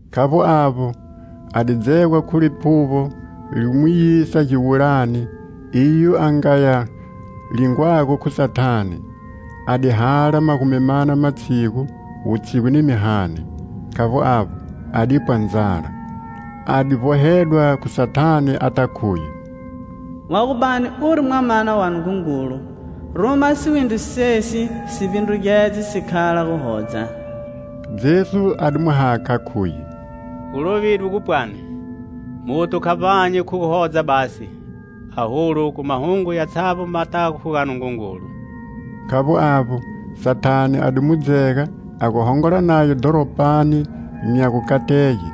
Khavbo avbo, a di dzegwa khu Liphuvbo, li mu yisa giwulani, iyo a nga ya lingwago khu Sathane. A di hala magumi mana matshigu, wutshigu ni mihani. Khavbo avbo, a di pwa ndzala. A di vbohedwa khu Sathane, ata khuye: "Wa gu bani uri Mwamana wa Nungungulu, ruma siwindri sesi si vbindrugedze si khala guhodza." Jesu a di mu hakha, khuye: "Gu lovidwe gu pwani: 'Muthu kha vbanyi khu guhodza basi, aholu, khu mahungo yatshavbo matago khu ga Nungungulu.' " Khavbo avbo, Sathane a di mu dzega a gu hongola naye dhoropani nya gukatege;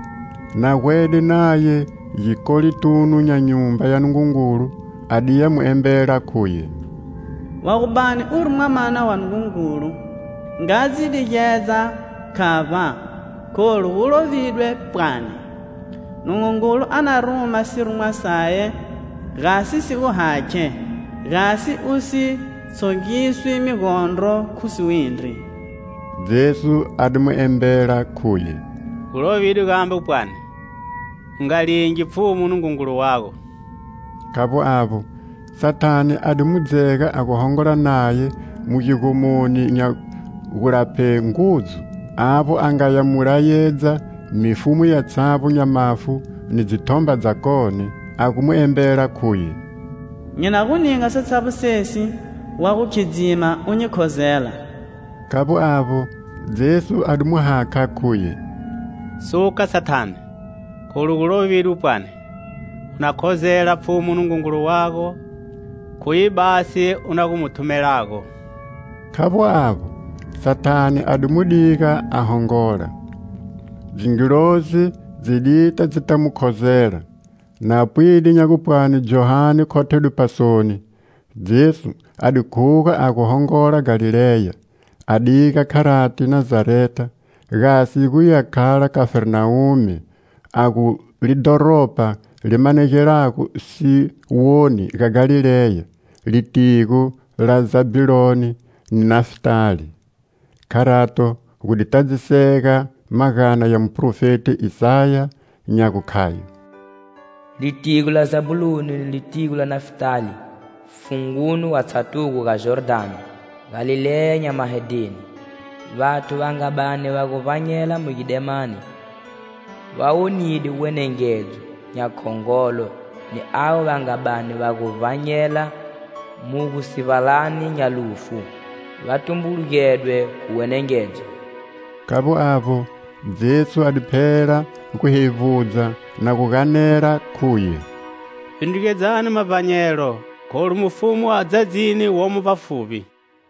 na gwede naye gikolitunu nya Nyumba ya Nungungulu, a diya mu embela khuye: "Wa gu bani uri Mwamana wa Nungungulu, nga dzi digedza khavba, kholu gu lovidwe pwani: 'Nungungulu a na ruma sirumwa saye gasi si gu hakhe, gasi usi tshongiswi migondro khu siwindri.' " Jesu a di mu embela khuye: "Gu lovidwe gambe pwani: 'U nga lingi Pfhumu Nungungulu wago!' " Khavbo avbo, Sathane a di mu dzega a gu hongola naye mu gigomoni nya gulapshe ngudzu, avbo a ngaya mu leyedza mifumu yatshavbo nya mafu ni dzithomba dzakone, a gu mu embela khuye: "Nyi na gu ninga satshavbo sesi, wa gu khidzima u nyi khozela." Khavbo avbo, Jesu a di mu hakha khuye: "Suka, Sathane, kholu gu lovidwe, pwani: 'U na khozela Pfhumu Nungungulu wago; khuye basi u na gu mu thumelago.' " Khavbo avbo, Sathane a di mu diga a hongola; dzingilozi dzi dita dzita mu khozela. Na pwide nya gupwani Johane khothedwe pasoni, Jesu a di khuga a gu hongola Galileya; a diga, kharati, Nazareta, gasi guya khala Khafarnawume, a gu lidhoropa li manegelago siwoni ga Galileya, litigo la Zabhuloni ni Nafitali. Kharato gu di tadzisega magana ya muphrofeti Isaya, nya gukhayo: "Litigo la Zabhuloni ni litigo la Nafitali,funguni wa tshatugo ga Jordhani,Galileya nya mahedheni. Vathu va nga bani va gu vbanyela mu gidemani, va wonide wenengedzo nya khongolo ni avo va nga bani va gu vbanyela mu gusivbalani nya lufu,va tumbulugedwe khu wenengedzo." Khavbo avbo, Jesu a di phela gu hevbudza, na gu ganela khuye: "Vbindrugedzani mavbanyelo, kholu mufumu wa ndzadzini womo vbafuvbi."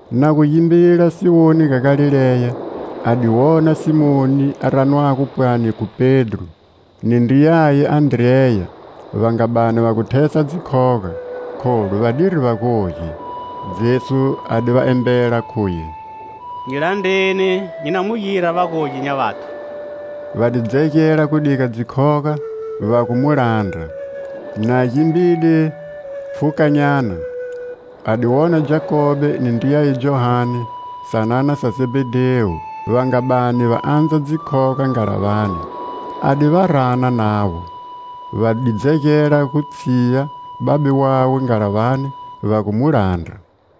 Na gu gimbila siwoni ga Galileya, a di wona Simoni, a ranwago pwani khu Pedro, ni ndriyaye Andreya, va nga bani va gu thesa dzikhoga, kholu va diri vagogi. Jesu a di va embela khuye: "Nyi landreni, nyi na mu gira vagogi nya vathu." Va di dzegela gu diga dzikhoga, va gu mu landra. Na gimbide pfhukanyana, a di wona Jakobe ni ndriyaye Johane, sanana sa Zebhedhewu, va nga bani va andza dzikhoga ngalavani. A di va rana navo. Va di dzegela gu tshiya babe wawe ngalavani, va gu mu landra.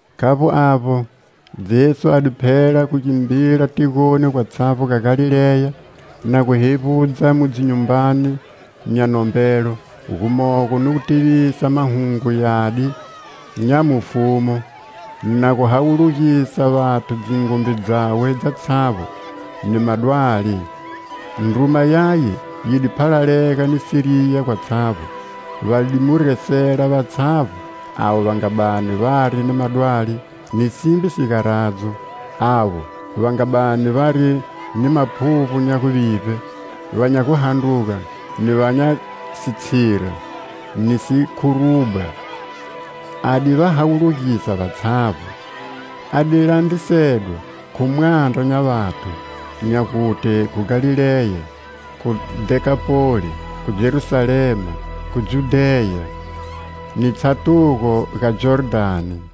Khavbo avbo, Jesu a di phela gu gimbila tigoni gwatshavbo ga Galileya, na gu hevbudza mu dzinyumbani nya nombelo, gumogo ni gu tivisa Mahungu Yadi nya mufumu, na gu hawulugisa vathu dzingumbe dzawe dzatshavbo, ni madwali. Ndruma yaye yi di phalalega ni Siriya gwatshavbo. Va di mu resela vatshavbo avo va nga bani vari ni madwali ni simbe sigaradzo; avo va nga bani vari ni maphuvbo nya guvivbe, va nya guhandruga ni va nya sitshira, ni sikhurubwa. A di va hawulugisa vatshavbo. A di landrisedwa khu mwandra nya vathu, nya gute khu Galileya, khu Dhekapoli, khu Jerusalema, khu Judheya ni tshatugo ga Jordhani.